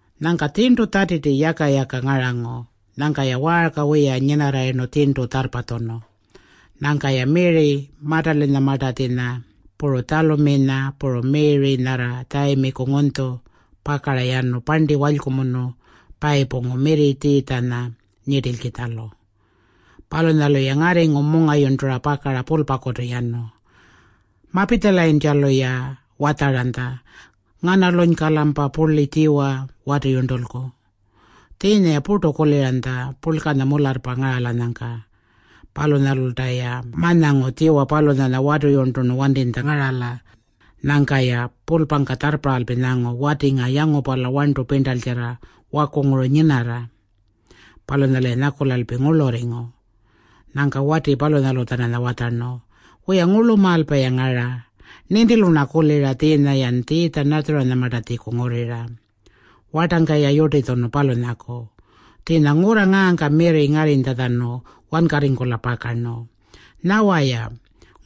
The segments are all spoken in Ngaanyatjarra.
Nyangka tjirntu Tjatiti yaka-yaka ngarangu. Nyangka-ya waarka wiya nyinarrayirnu tjirntu tjarrpatjunu. Nyangka-ya Miri-Matalanyamartatjinya, puru Tjaluminya, puru Miri nyarra Tjayimiku ngunytju pakara yanu parnti walykumunu payipungu mirri Tjiitjanya nyirtilkitjalu. Palunyalu-ya ngarringu mungayurntura pakara pulpakutu yanu. Mapitjalayintjalu-ya watjaranytja, “Nganalunyka-lampa purli tjiwa watiyurntulku?” Tjiinya-ya purtu kuliranytja purlkanya mularrpa ngaralanyangka. Palunyalulta-ya ma-nyangu tjiwa palunyanya watiyurnturnu wantinytja ngarala. Nyangka-ya pulpangka tjarrparralpi nyangu, “Wati ngaa yangupala warntu pirntaltjarra wakunguru nyinarra.” Palunyalu-ya nyakulalpi ngurlurringu. Nyangka wati palunyalu-tjananya watjarnu, “Wiya, ngurlumaalpa-ya ngara. Nintilu-rna kulira tjiinya-yan Tjiitja-Natjarinyamartatjiku ngurrira, wartangka-ya yurtitjunu, palunyaku. Tjiinya ngurra ngaangka mirri ngarrinytjatjanu wankarringkula pakarnu. Nyawa-ya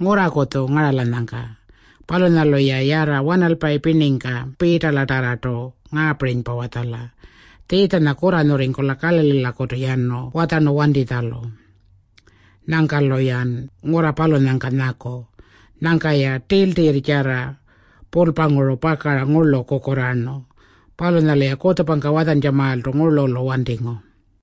ngurrakutju ngaralanyangka. Palunyalu-ya yarra wanalpayi pirningka Piitalatarrartu ngaapirinypa watjala, ‘Tjiitjanya kurranyurringkula Kalalilakutu yanu watjarnu wantitjalu. Nyangka-luyan ngurra palunyangka nyaku.’” Nyangka-ya tiltirrtjarra pulpanguru pakara ngurlu kukurraarnu. Palunyalu-ya kutjupangka watjantjamaaltu ngurlulu wantingu.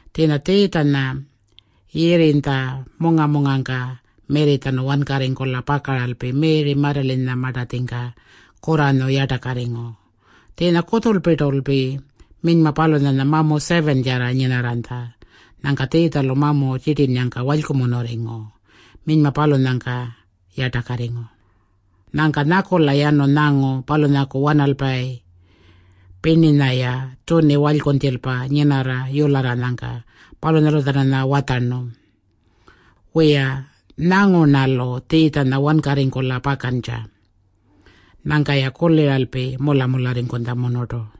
[Tjiinya Tjiitjanya Yirrinytja munga-mungangka mirritjanu wankarringkula pakaralpi Miri-Matalanyamartatjingka kurranyu yartakarringu. Tjiinya kutjulpirtulpi minyma palunyanya mamu 7-tjarra nyinarranytja. Nyangka Tjiitjalu mamu tjirtinnyangka walykumunurringu. Minyma palunyangka yartakarringu. Nyangka nyakula yanu nyangu palunyaku wanalpayi pirninya-ya tjuni walykunytjilpa nyinarra yularranyangka. Palunyalu-tjananya watjarnu, “Wiya, nyangu-rnalu Tjiitjanya wankarringkula pakantja.” Nyangka-ya kuliralpi mula-mularringkutjamunurtu.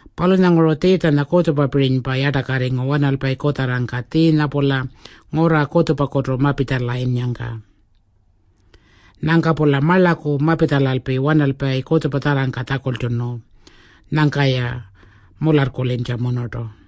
Palunyanguru Tjiitjanya kutjupapirinypa yartakarringu wanalpayi kutjarrangka tjiinya-pula ngurra kutjupakutu mapitjalayinnyangka. Nyangka-pula marlaku mapitjalalpi wanalpayi kutjupatjarrangka tjakultjunu. Nyangka-ya mularrkulintjamunurtu.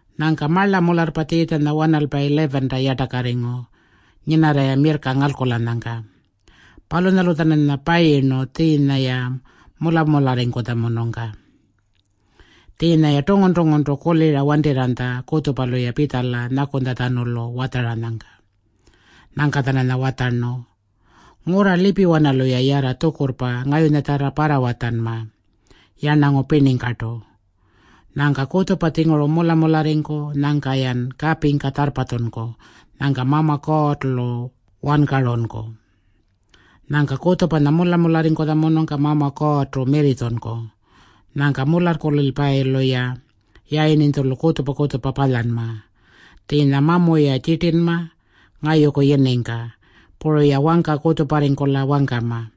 Nyangka marla mularrpa Tjiitjanya wanalpayi 11-ta yartakarringu nyinarra-ya mirrka ngalkulanyangka. Palunyalu-tjananya payirnu tjiinya-ya mula-mularringkutjamunungka. Tjiinya-ya tungun-tunguntu kulira wantirranytja kutjupalu-ya pitjala nyakunytjatjanulu watjaranyangka. Nyangka-tjananya watjarnu, “Ngurra lipiwanalu-ya yarra tjukurrpa ngayunyatjarra parrawatjanma yarnangu pirningkartu. Nyangka kutjupanya-tjinguru mula-mularringku. Nyangka-yan kapingka tjarrpatjunku. Nyangka Mama Kuurrtu-lu wankarunku. Nyangka kutjupanya mula-mularringkutjamunungka Mama Kuurrtu mirritjunku. Nyangka mularrkulilpayilu-ya yayirninytjulu kutjupa-kutjupa palyanma. Tjiinya mamu-ya tjirtinma ngayuku yiningka. Puru-ya wangka kutjuparringkula wangkama.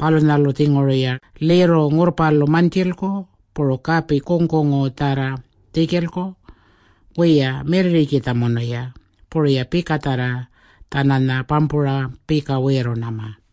Palunyalu-tjinguru-ya lirru ngurrpalu mantjilku, puru kapi kungkungutjarra tjikilku. Wiya, mirrirrikitjamunu-ya. Puru-ya pikatjarra-tjananya pampura pika wiirrunma.”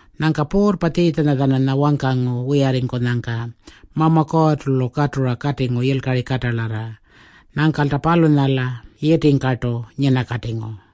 Nyangka Puurrpa Tjiitjanya-tjananya wangkangu wiyarringkunyangka Mama Kuurrtu-lu katura katingu yilkari katalarra. Nyangkalta palunyala yitingkartu nyinakatingu.